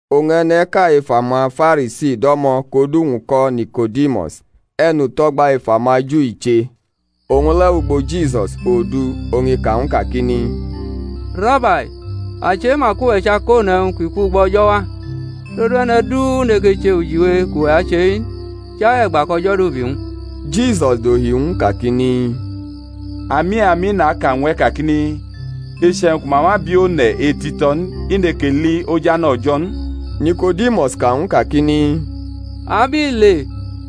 Oñ e̩ne̩ʼka ef amaFarisi do̩mo̩ kʼodu-wñ ko̩ Nikodimus, e̩nuto̩gba ef amaju i che; owñ le̩ wʼugbo Jisus odu, oñ i ka ñw u kakini, Rabai, a chema kʼuwe̩ chʼakone̩wñ ki kwugbo O̩jo̩ wa; todu e̩ne̩ du neke che ujiwe kʼuwe̩ ache-i n, chai e̩gba kʼO̩jo̩ dʼubi wñ. Jisus dohi ñw u kakini, Ami, ami, naka ñw e̩ kakini, Iche̩wñ ku ma ma bi one̩ etito̩ n i neke li ojane̩ O̩jo̩ n. Niko̩dimus ka ñw u kakini, Abile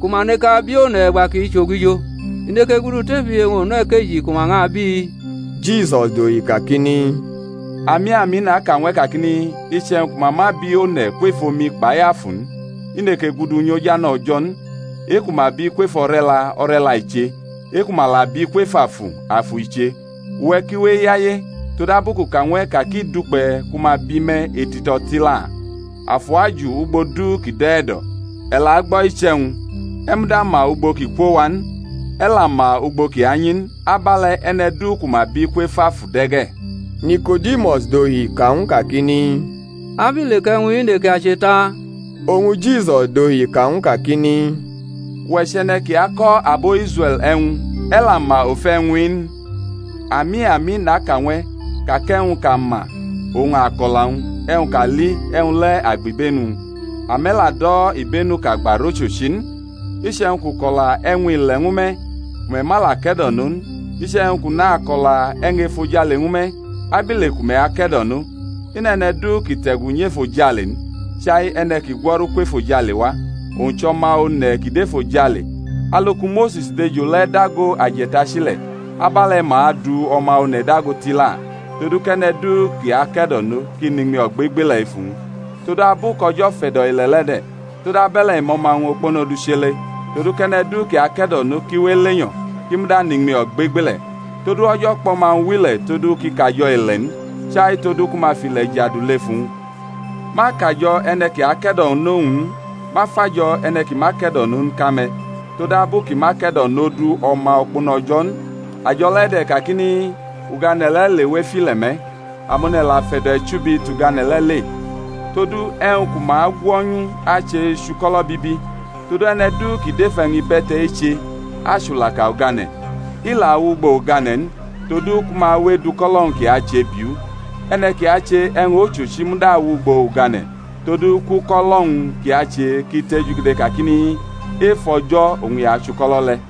ku ma nekʼabi one̩ e̩gba kʼi chʼogijo? I neke gudu tʼefu iye-wñ onuʼkeji ku ma ñʼabi? Jisus dohi kakini, Ami, ami naka ñw e̩ kakini, Iche̩wñ ku ma ma bi one̩ kwef omi kpai Afu n, i neke gudu nyʼojane̩ O̩jo̩ n. E-ku ma bi kwef o̩re̩la, o̩re̩la i che; e-ku ma la bi kwef Afu, afu i che. Uwe̩ ki we eyaye todabu kʼu ka ñw e̩ ka ki dukpe̩ ku ma bi me̩ etito̩ tila. Afu aju ugbo du ki dʼe̩ e̩do̩, e̩ la gbo̩ iche̩wñ, e̩ muda ma ugbo kʼi kwo wa n, e̩ la ma ugbo kʼi anyi n; abe̩le̩ e̩ne̩ du ku ma bi kwef Afu de̩ ge̩. Niko̩dimus dohi ka ñw u kakini, Abile kʼe̩wñ-i neke ache ta? Oñ Jisus dohi ka ñw u kakini, Uwe̩ chʼe̩ne̩ ki ako̩ abo Israe̩l e̩wñ, e̩ la ma ofe e̩wñ-i n? Ami, ami, naka ñw e̩ ka kʼe̩wñ kʼa ma oñ a kʼo̩la-wñ, e̩wñ kʼa li e̩wñ le̩ a gbʼibenu-wñ; ame̩ la do̩ ibenu kʼa gba rʼochochi n. Iche̩wñ kʼu ko̩la e̩wñ ile̩ ñwu me̩, ku me̩ ma la ke̩do̩no n, iche̩wñ kʼu nako̩la e̩wñ efojale ñwu me̩, abile ku me̩ ake̩do̩no? I nʼe̩ne̩ du ki te̩gu nyʼefojale n, chai e̩ne̩ ki gwo̩ru kwʼefojale wa, owñ chʼO̩ma One̩ kʼi dʼefojale. Alu ku Mose̩s dʼejo le̩ dago aje̩tachi le̩ abe̩le̩ ma adu O̩ma One̩ dago tila, todu kʼe̩ne̩ du kʼi ake̩do̩no kʼi nʼiñmi ogbegbeie̩ ef uwñ. Todu, abu kʼO̩jo̩ fe̩do̩ ile̩ le̩ de̩, todabe̩le̩ i mʼO̩ma-wñ okpono duchele, todu kʼe̩ne̩ du ki ake̩do̩nʼo ki we elenyo̩, kʼi muda nʼiñmi ogbegbeie̩. Todu O̩jo̩ kpʼO̩ma-wñ wʼile̩ todu kʼi kajo̩ ile̩ n, chai todu ku ma fʼile̩ jadu lef uwñ. Ma akajo̩ e̩ne̩ ki ake̩do̩nʼowñ n; ma fʼajo̩ e̩ne̩ ki ma ke̩do̩nʼo n ka me̩, todabu kʼi ma ke̩do̩nʼodu O̩ma okpono O̩jo̩ n. Ajo̩ le̩ de̩ kakini, Ugane̩ le̩ lewʼef ile̩ me̩, amone̩ la fe̩do̩ e̩chubi tʼugane̩ le̩ le; todu e̩wñ ku ma agwo̩nyu ache chʼuko̩lo̩ bibi. Todu e̩ne̩ du ki dʼef e̩wñ ibe̩te̩ eche achʼulaka ugane̩, i la awʼugbo ugane̩ n, todu ku ma we edʼuko̩lo̩-wñ kʼi ache biʼu. E̩ne̩ ki ache e̩wñ ochochi muda awʼugbo ugane̩, todu kʼuko̩lo̩-wñ kʼi ache ki tejugede kakini, Ef O̩jo̩ oñ i achuko̩lo̩ le̩.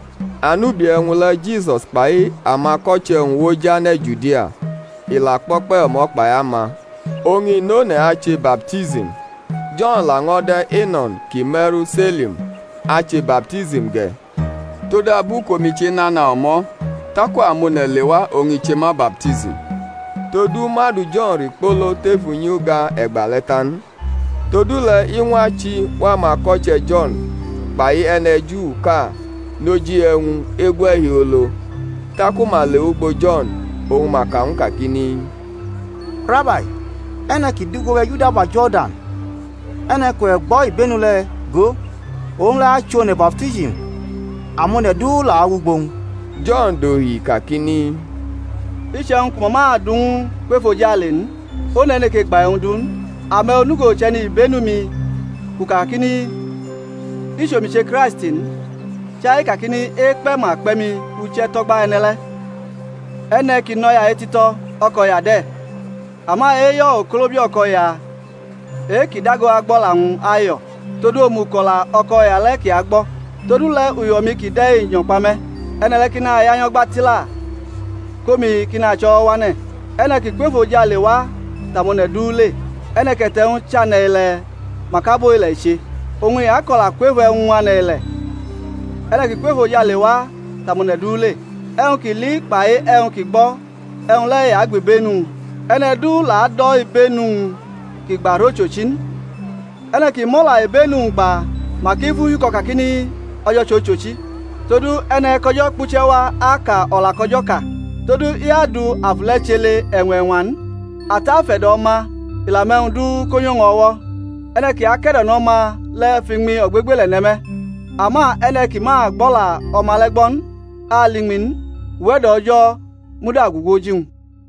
Anubi e̩wñ le̩ Jisus kpai amako̩che̩-wñ wʼoj ane̩ Judia, i la kpo̩kpe̩ o̩mo̩ kpai ama, oñ i nʼone̩ ache baptism. Jo̩n la ño̩ de̩ Eno̩n ki me̩ru Selim ache baptism ge̩, todabu kʼomi chenana o̩mo̩; taku amone̩ lewa oñ i che ma baptism. Todu ma du Jo̩n rikpolo tef unyi-uga e̩gbale̩ ta n. Todule̩ iñwa chi ñw amako̩che̩ Jo̩n kpai e̩ne̩Juʼka noji e̩wñ egwe̩ hiolo. Taku ma le wʼugbo Jo̩n, oñ ma ka ñw u kakini, Rabai, e̩ne̩ ki dʼugbo we̩ ejudaba Jo̩rdan, e̩ne̩ kʼuwe̩ gbʼo̩ ibenu le̩, go, owñ le̩ achʼone̩ baptism amone̩ du la wʼugbo-wñ. Jo̩n dohi kakini, Iche̩wñ ku ma ma du ñw u kwʼefojale n, one̩ neke gba e̩wñ du n. Ame̩ onugo chʼe̩nibenu-mi kʼu kakini, I chʼomi che Kraisti n, chai kakini, Ekpe̩ ma kpe̩ mi uche̩ tʼo̩gba e̩ne̩ le̩. E̩ne̩ ki nʼo̩ya etito̩, o̩ko̩ya de̩; ama eyo̩ okolobia o̩ko̩ya, e-kʼi dago agbʼo̩la-wñ ayo̩, tod omuko̩la o̩ko̩ya le̩ kʼi agbo̩; todule̩ uyo̩-mi kide̩ nyo̩ kpa me̩. E̩ne̩ le̩ ki naya nyo̩gba tila, kʼomi ki nacho̩wo̩wane̩. E̩ne̩ ki kwʼefojale wa tʼamone̩ du le; e̩ne̩ kʼe̩te̩-wñ chʼane̩-ilee̩mak abo ile̩ i che, oñ i ako̩la kwef e̩wñ ane̩-ile̩; e̩ne̩ ki kwʼefojale wa tʼamone̩ du le. E̩wñ kʼi li kpai e̩wñ kʼi gbo̩ e̩wñ le̩ i agbʼibenu-wñ; e̩ne̩ du la ado̩ ibenu-wñ kʼi gba rʼochochi n. E̩ne̩ ki mʼo̩la ibenu-wñ gba, mak i fʼu hiuko̩ kakini, O̩jo̩ chʼochochi. Todu e̩ne̩ kʼO̩jo̩ kpuche̩ wa aka o̩la kʼO̩jo̩ ka; todu i adu Afu le̩ chele e̩ñwa-e̩ñwa n. Ata afe̩do̩ O̩ma, i la mʼe̩wñ du ko nyʼowñ o̩wo̩. E̩ne̩ ki ake̩do̩nʼO̩ma le̩ fʼiñmi ogbegbele̩ ne̩ me̩; ama e̩ne̩ ki ma agbʼo̩la O̩ma le̩ gbo̩ n ali iñmi n, uwe̩do̩ O̩jo̩ muda gugu oji-wñ.